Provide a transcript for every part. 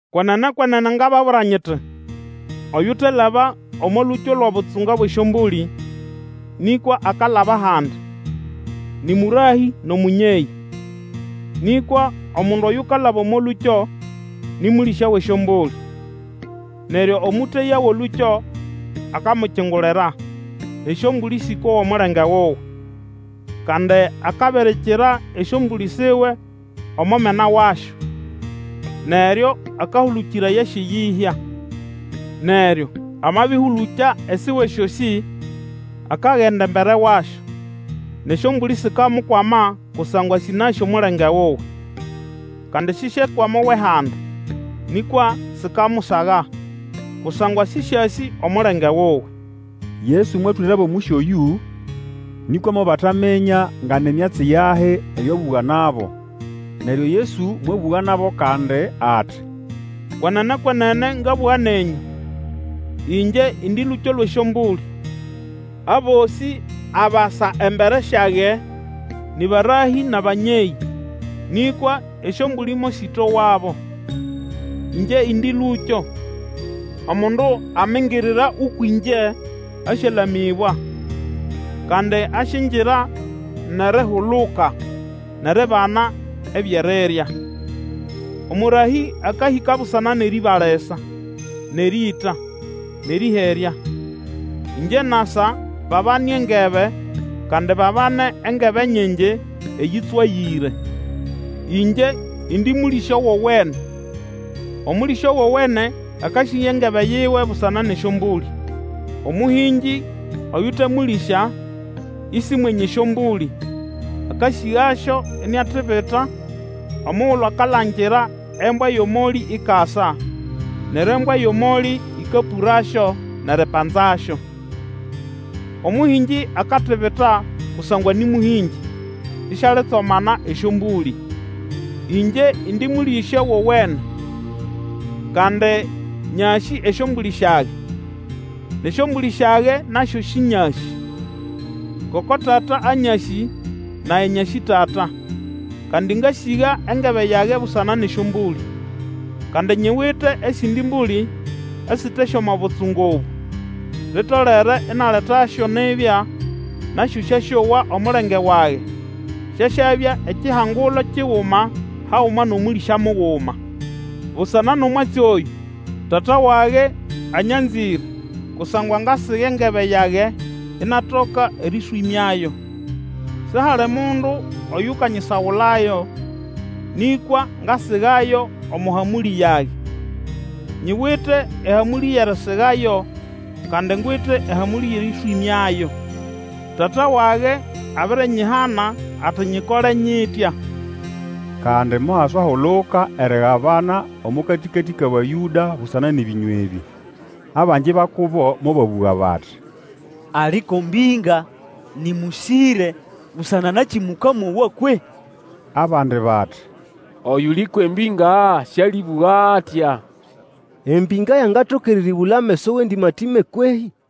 Kwenene, kwenene ngababwira nyiti, Oyutelaba omo lũkyo lwʼobutsunga bwʼesyombũlĩ, nĩkwa akalaba handi, nĩ mũrahĩ nʼomũnyeyĩ. Nĩkwa omundu oyukalaba omo lũkyo nĩ mũlĩsya wʼesyombũlĩ. Neryo omũteya wʼolũkyo akamukingulira, nʼesyombũlĩ Sĩkowa omulenge wuwe, kandi akabirikira esyombũlĩ siwe omo mena wasyo, neryo akahũlũkĩraya syʼeyĩhya. Neryo amabĩhũlũkya esiwe syosĩ, akagenda embere wasyo, nʼesyombũlĩ sikamukwama kusangwa sĩnasĩ omulenge wuwe. Kandi sisyekwama owʼehandi, nĩkwa sikamusaga, kusangwa sĩsĩasĩ omulenge wuwe. Yesu mwatwĩrabo omũsyo oyũ, nĩkwa mobataminya nga ni myatsi yahi eyo abũga nabo. Neryo Yesu mwabũga nabo kandi, ati, Kwenene, kwenene ngabũga nenyũ, Ingye indi lũkyo lwʼesyombũlĩ. Abosĩ abasa embere syage nĩ barahĩ nʼabanyeyĩ, nĩkwa esyombũlĩ mosĩtowabo. Ĩngye indi lũkyo, omundu amingirira ũkwʼĩngye asyalamĩbwa; kandi asyingira nʼerihuluka, nʼeribana ebyʼerirya. Omũrahĩ akahĩka busana nʼerĩĩba lisa, nʼerĩĩta, nʼerĩherya. Ingye nasa babane engebe, kandi babane engebe nyingi eyĩtswagĩre. Ĩngye indi mũlĩsya wowene. Omũlĩsya wowene akasiga engebe yiwe busana nʼesyombũlĩ. Omũhĩngĩ, oyute mũlĩsya isi mwenye esyombũlĩ, akasĩgasyo, iniatibita omugulu akalangira embwa yʼomolĩ ikasa, neryo embwa yʼomolĩ ĩkapũrasyo, nʼeripanzasyo. Omũhĩngĩ akatibita kusangwa nĩ mũhĩngĩ, isialitsomana esyombũlĩ. Ĩngye indi mũlĩsya wowene. Kandi nyasĩ esyombũlĩ syage, nʼesyombũlĩ syage nasyo Sĩnyasĩ. Ngoko Tata anyasĩ, nage nyasĩ Tata; kandi ngasiga engebe yage busana nʼesyombũlĩ. Kandi nyiwite esindi mbũlĩ, esite syʼomo butsunga obũ; litolere inaletasyo nibya, nasyo syasyowa omulenge wage; syasyabya ekihangulo kiguma haguma nʼomũlĩsya muguma. Busana nʼomwatsi oyũ, Tata wage anyanzĩre kusangwa ngasiga engebe yage inatoka erĩswĩmyayo. Sihali mundu oyukanyisagulayo, nĩkwa ngasigayo omo hamũlĩ yage. Nyiwite ehamũlĩ yʼerisigayo, kandi ngwite ehamũlĩ yʼerĩswĩmyayo. Tata wage abirinyihana ati nyikole nyitya. Kandi mohaswahuluka erigabana omo katĩkatĩ kʼAbayũda busana nʼebĩnywa ebĩ. Abangi ba kubo mobabũga bati, Ali ko mbĩnga! Nĩ mũsĩre! Busana nakĩ mũkamowa kwehĩ! Abandi bati, Oyuli kwʼembĩnga sĩalĩbũga atya. Embĩnga yangatoka erĩrĩbũla ameso wʼendĩmatĩme, kwehĩ?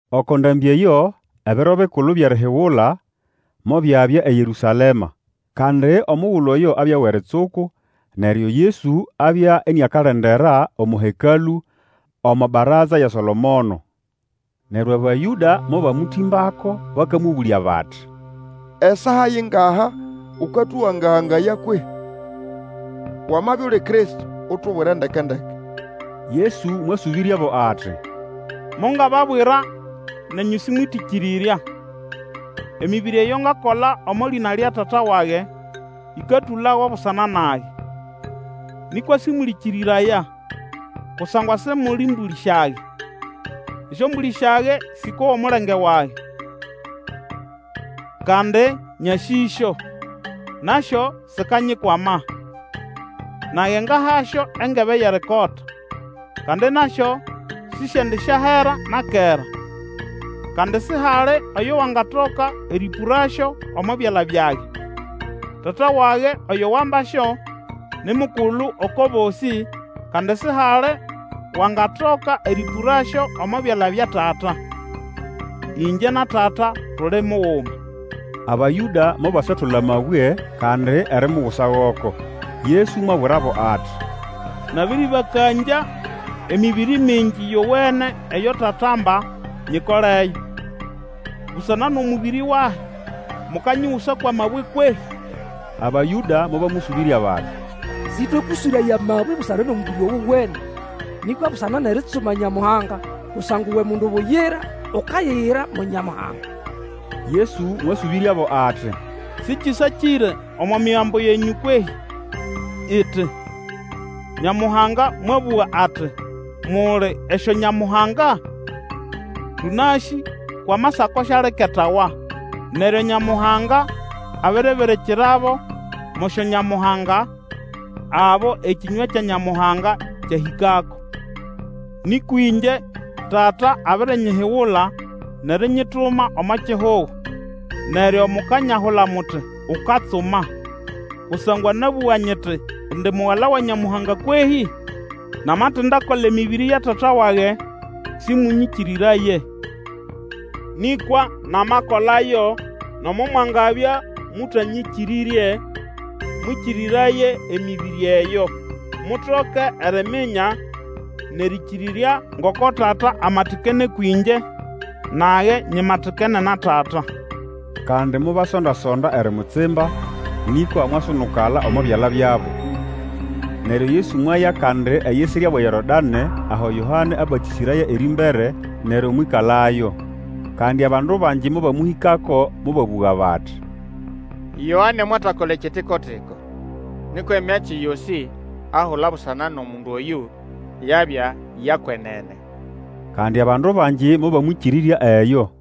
Oko ndambĩ eyo Ebiro Bikulu byʼErihigula mobyabya eYerũsalema. Kandi omugulu oyo abya wʼeritsuku, neryo Yesu abya iniakalendera omo Hekalũ omo baraza ya Solomono. Neryo Abayũda mobamũtĩmbako bakamũbũlya bati, Esaa yingaha ũkatũganga-gangaya kwehĩ? Wamabya uli Kristo, utubwire ndeke-ndeke. Yesu mwasũbĩryabo ati, Mongababwira, nenyũ simwetĩkĩrĩrya. Emĩbĩrĩ eyo ngakola omo lĩna lya Tata wage, ĩkatũlago busana nage. Nĩkwa sĩmũlĩkĩrĩraya, kusangwa Simuli mbũlĩ syage. Esyombũlĩ syage Sĩkowa omulenge wage; kandi nyasĩsyo, nasyo sikanyikwama. Nage ngahasyo engebe yʼerikota, kandi nasyo sisyendisyahera na kera, kandi sihali oyo wangatoka erĩpũrasyo omo byala byage. Tata wage oyo wambasyo, ni mukulu oko bosĩ, kandi sihali wangatoka erĩpũrasyo omo byala bya Tata. Ĩngye na Tata tuli muguma. Abayũda mobaswatola amabwe kandi erimugusa goko. Yesu mwabwirabo ati, Nabĩrĩbakangya emĩbĩrĩ mingi yowene eyo Tata amba nyikoleyo; busana nʼomũbĩrĩ wahi mukanyigusa kwʼamabwe kwehĩ? Abayũda mobamũsũbĩrya bati, Sĩtwekũswĩraya amabwe busana nʼomũbĩrĩ owene, nĩkwa busana nʼeritsuma Nyamuhanga! Kusangwa uwe mundu buyira, ukayiyira mo Nyamuhanga! Yesu mwasũbĩryabo ati, Sĩkĩsakĩre omo Migambo yenyũ kwehĩ, iti, Nyamuhanga mwabũga ati, Muli esyonyamuhanga? Tũnasĩ kwʼAmasako sialiketawa, neryo Nyamuhanga abiribirikirabo mo syonyamuhanga abo ekĩnywa kya Nyamuhanga kyahĩkako. Nĩkwa ĩngye, Tata abirinyihigula nʼerinyituma omo kihugo. Neryo mukanyahula muti, Ukatsuma, kusangwa nabũga nyiti indi Mugala wa Nyamuhanga kwehĩ? Namatindakola emĩbĩrĩ ya Tata wage, sĩmũnyĩkĩrĩraye. Nĩkwa namakolayo, nomo mwangabya mũtanyĩkĩrĩrye, mwĩkĩrĩraye emĩbĩrĩ eyo, mutoke eriminya nʼerĩkĩrĩrya ngoko Tata amatikene ũkwʼĩngye, nage nyimatikene na Tata. Kandi mobasonda-sonda erimutsimba, nĩkwa mwasunukala omo byala byabo. Neryo Yesu mwaya kandi eyisirya wʼeYorodanĩ aho Yoane abatĩsĩraya erĩmbere, neryo mwĩkalayo. Kandi abandu bangi mobamũhĩkako, mobabũga bati, Yoane mwatakola ekitiko-tiko, nĩkwa emyatsi yosĩ ahula busana nʼomundu oyũ, yabya ya kwenene. Kandi abandu bangi mobamwĩkĩrĩrya eyo.